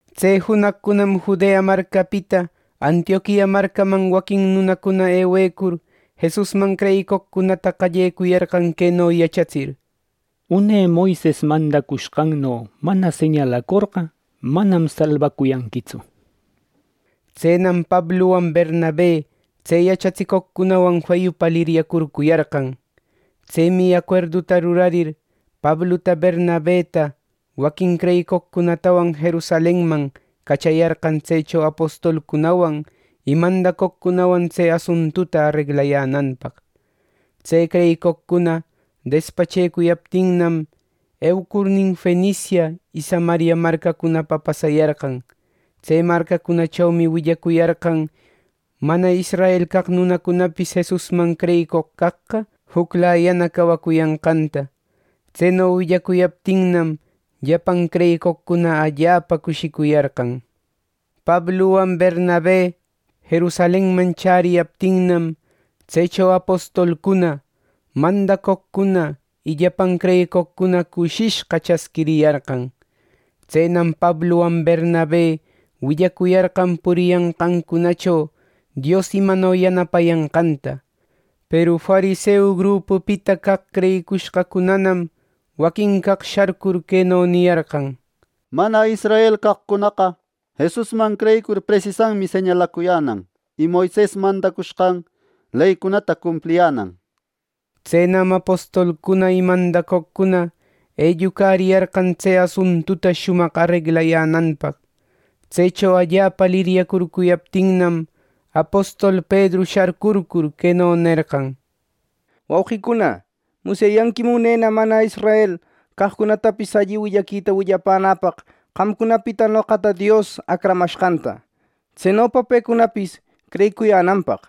Tse junaqcunam Judea marcapita Antioquia marcaman waquin nunacuna ewecur, Jesusman creyicoqcunata qallecuyarqan queno yachatsir: —Une Moises mandacushqanno mana señalacorqa, manam salbacuyanquitsu —nishpa. Tsenam Pabluwan Bernabe tse yachatsicoqcunawan feyupa liryacurcuyarqan. Tsemi acuerduta rurarir, Pabluta Bernabeta waquin creyicoqcunatawan Jerusalenman cachayarqan tsecho apostolcunawan y mandacoqcunawan tse asuntuta areglayänanpaq. Tse creyicoqcuna despachecuyaptinnam, eucurnin Fenicia y Samaria marcacunapa pasayarqan. Tse marcacunachomi willacuyarqan mana israel caq nunacunapis Jesusman creyicoq caqqa juclayana cawacuyanqanta. Tseno willacuyaptinnam, llapan creyicoqcuna allapa cushicuyarqan. Pabluwan Bernabe Jerusalenman chäriyaptinnam, tsecho apostolcuna, mandacoqcuna y llapan creyicoqcuna cushishqa chasquiriyarqan. Tsenam Pabluwan Bernabe willacuyarqan puriyanqancunacho Dios imano yanapayanqanta. Peru fariseu grupupita caq creyicushqacunanam waquin caq sharcur queno niyarqan: —Mana israel caqcunaqa Jesusman creyicur presisanmi señalacuyänan y Moises mandacushqan leycunata cumpliyänan —nir. Tsenam apostolcuna y mandacoqcuna ellucariyarqan tse asuntuta shumaq areglayänanpaq. Tsecho allapa liryacurcuyaptinnam, apostol Pedru sharcurcur queno nerqan: —Wauqicuna, musyayanquim unena mana israel caqcunatapis alli willaquita willapänäpaq qamcunapita noqata Dios acramashqanta, tsenopa pecunapis creyicuyänanpaq.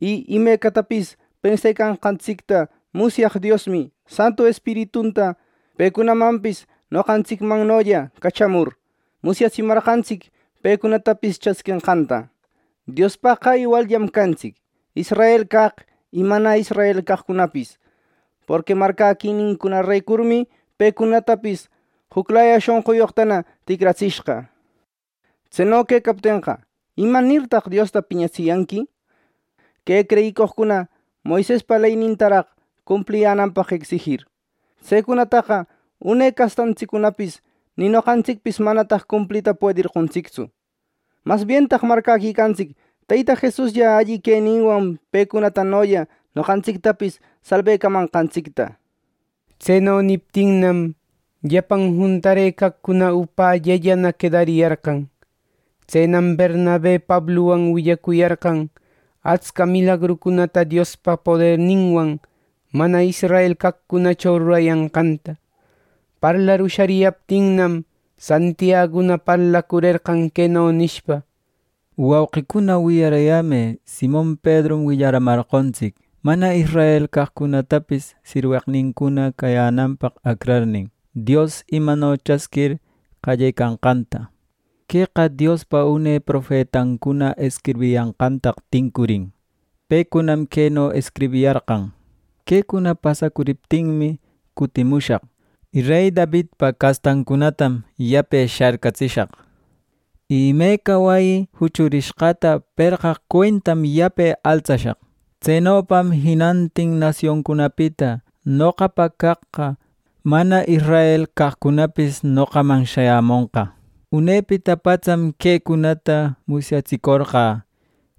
Y imecatapis pensecanqantsicta musyaq Diosmi Santu Espiritunta pecunamanpis noqantsicmannolla cachamur, musyatsimarqantsic pecunatapis chasquenqanta. Diospaqqa iwalllam cantsic, israel caq y mana israel caqcunapis, porqui marcäquinincunarecurmi pecunatapis juclaya shonquyoqtana ticratsishqa. Tseno quecaptenqa, ¿Imanirtaq Diosta piñatsiyanqui, que creyicoqcuna Moisespa leynintaraq cumpliyänanpaq ecsijir? Tsecunataqa une castantsiccunapis ni noqantsicpis manataq cumplita puederqontsictsu. ¡Mas bientaq marcäquicantsic Teyta Jesuslla alli queninwan pecunatanolla noqantsictapis salbecamanqantsicta! Tseno niptinnam, llapan juntarëcaqcuna upällällana quedariyarqan. Tsenam Bernabe Pabluwan willacuyarqan atsca milagrucunata Diospa poderninwan mana israel caqcunacho rurayanqanta. Parlar ushariyaptinnam, Santiaguna parlacurerqan queno nishpa: —Wauqicuna, wiyaräyämë. Simon Pedrum willaramarqontsic mana israel caqcunatapis sirweqnincuna cayänanpaq acrarnin, Dios imano chasquir qallecanqanta. Queqa Diospa une profetancuna escribiyanqantaq tincurin. Pecunam queno escribiyarqan: ‘Quecuna pasacuriptinmi cutimushaq, y rey Davidpa castancunatam yape sharcatsishaq; y imeca wayi juchurishqata perqaq cuentam yape altsashaq. Tsenopam jinantin nasioncunapita noqapa caqqa mana israel caqcunapis noqaman shayamonqa. Unepita patsam quecunata musyatsicorqä,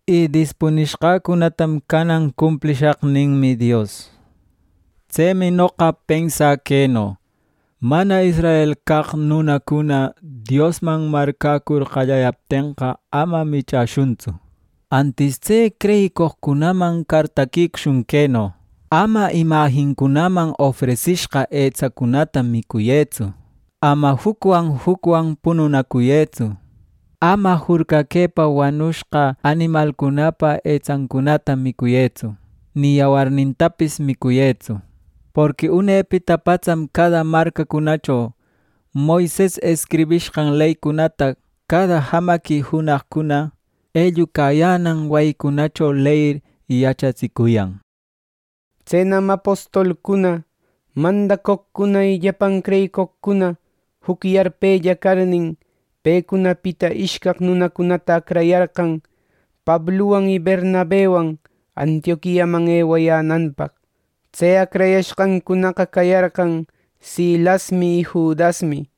y dispunishqäcunatam canan cumplishaq’ ninmi Dios. “Tsemi noqa pensä queno: Mana israel caq nunacuna Diosman marcäcur qallayaptenqa, ama michäshuntsu. Antis tse creyicoqcunaman cartaquicushun queno: ‘Ama imajincunaman ofresishqa etsacunata micuyëtsu; ama jucwan jucwan pununacuyëtsu; ama jurcaquëpa wanushqa animalcunapa etsancunata micuyëtsu ni yawarnintapis micuyëtsu’ nishpa. Porqui unepita patsam cada marcacunacho Moises escribishqan leycunata cada jamaqui junaqcuna ellucayänan wayicunacho leyir yachatsicuyan. Tsenam apostolcuna, mandacoqcuna y llapan creyicoqcuna juc yarpella carnin, pecunapita ishcaq nunacunata acrayarqan Pabluwan y Bernabewan Antioquiaman ewayänanpaq. Tse acrayashqancunaqa cayarqan Silasmi y Judasmi.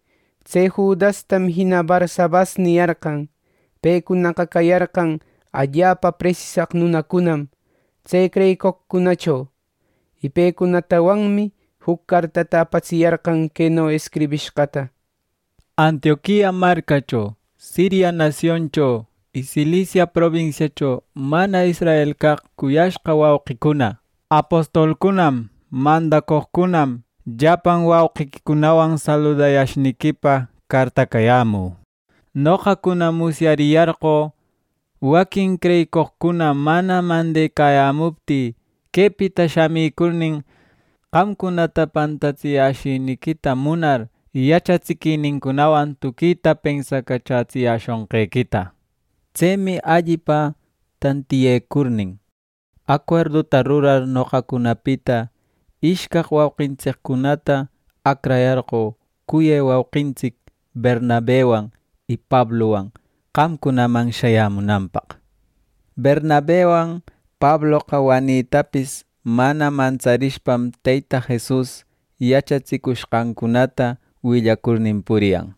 Tse Judastam jina Barsabas niyarqan. Pecunaqa cayarqan allapa presisaq nunacunam tse creyicoqcunacho. Y pecunatawanmi juc cartata apatsiyarqan queno escribishqata: “Antioquia marcacho, Siria nasioncho y Cilicia probinsiacho mana israel caq cuyashqa wauqicuna: Apostolcunam, mandacoqcunam, llapan wauqiquicunawan saludayashniquipa cartacayämü. Noqacunam musyariyarqö, waquin creyicoqcuna mana mandecayämuptï quepita shamicurnin, qamcunata pantatsiyäshïnïquita munar yachatsiquinincunawan tuquita pensacachätsiyäshonqequita. Tsemi allipa tantiyecurnin, acuerduta rurar noqacunapita ishcaq wauqintsiccunata acrayarqö cuyë wauqintsic Bernabewan y Pabluwan qamcunaman shayämunanpaq. Bernabewan Pabloqa wanitapis mana mantsarishpam Teyta Jesus yachatsicushqancunata willacurnin puriyan.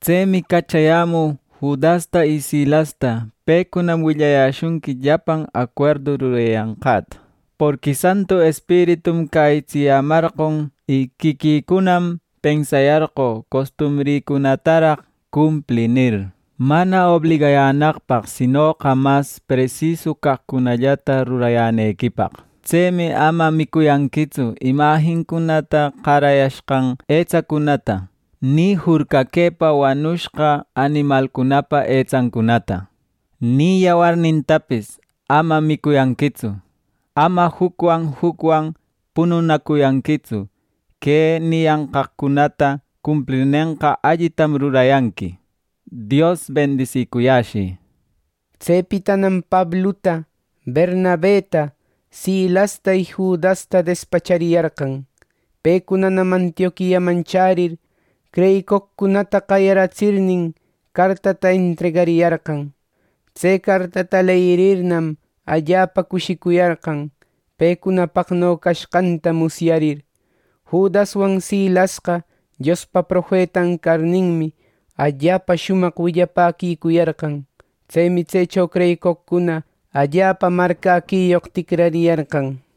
Tsemi cachayämü Judasta y Silasta. Pecunam willayäshunqui llapan acuerdu rurayanqäta. Porqui Santu Espiritum cäyitsiyämarqon y quiquïcunam pensayarqö ‘Costumbrïcunataraq cumplï’ nir, mana obligayänaqpaq, sinoqa mas presisu caqcunallata rurayänequipaq. Tsemi ama micuyanquitsu imajincunata qarayashqan etsacunata, ni jurcaquëpa wanushqa animalcunapa etsancunata, ni yawarnintapis ama micuyanquitsu. Ama jucwan jucwan pununacuyanquitsu. Que niyanqaqcunata cumplirnenqa allitam rurayanqui. Dios bendisicuyäshï” nir. Tsepitanam Pabluta, Bernabeta, Silasta y Judasta despachariyarqan. Pecunanam Antioquiaman chärir creyicoqcunata qayaratsirnin, cartata entregariyarqan. Tse cartata leyirirnam, allapa cushicuyarqan pecunapaqno cashqanta musyarir. Judaswan Silasqa Diospa profetan carninmi, allapa shumaq willapäquicuyarqan. Tsemi tsecho creyicoqcuna allapa marcäquiyoq ticrariyarqan.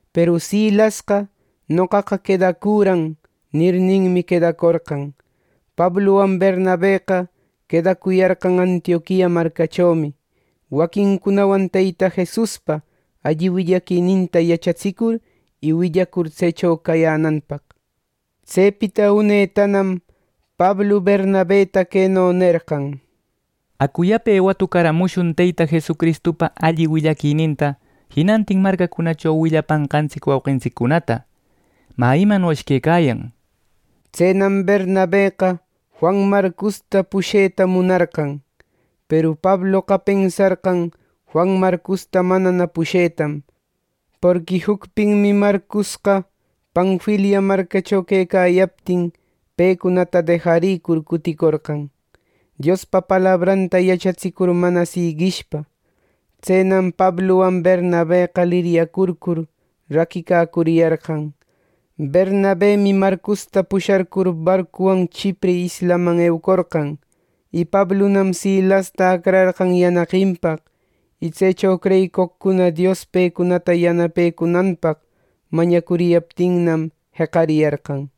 ˻Peru Silasqa “noqaqa quedacüran” nirninmi, quedacorqan.˼ Pabluwan Bernabeqa quedacuyarqan Antioquia marcachomi, waquincunawan Teyta Jesuspa alli willaquininta yachatsicur y willacur tsecho cayänanpaq. Tsepita unetanam Pablu Bernabeta queno nerqan: —Acu yape watucaramushun Teyta Jesucristupa alli willaquininta jinantin marcacunacho willapanqantsic wauqintsiccunata, ¿mä imanoshi quecayan? —nir. Tsenam Bernabeqa Juan Marcosta pusheta munarqan. Peru Pabloqa pensarqan Juan Marcosta manana pushetam, porqui jucpinmi Marcosqa Panfilia marcacho quecayaptin pecunata dejarïcur cuticorqan, Diospa palabranta yachatsicur mana siguishpa. Tsenam Pabluwan Bernabeqa liryacurcur raquicacuriyarqan. Bernabemi Marcosta pusharcur barcuwan Chipre islaman eucorqan, Y Pablunam Silasta acrarqan yanaqinpaq, y tsecho creyicoqcuna Dios pecunata yanapecunanpaq mañacuriyaptinnam, jeqariyarqan.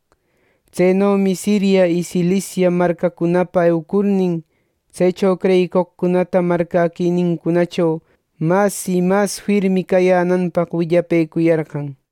Tsenomi Siria y Cilicia marcacunapa eucurnin, tsecho creyicoqcunata marcäquinincunacho mas y mas firmi cayänanpaq willapëcuyarqan.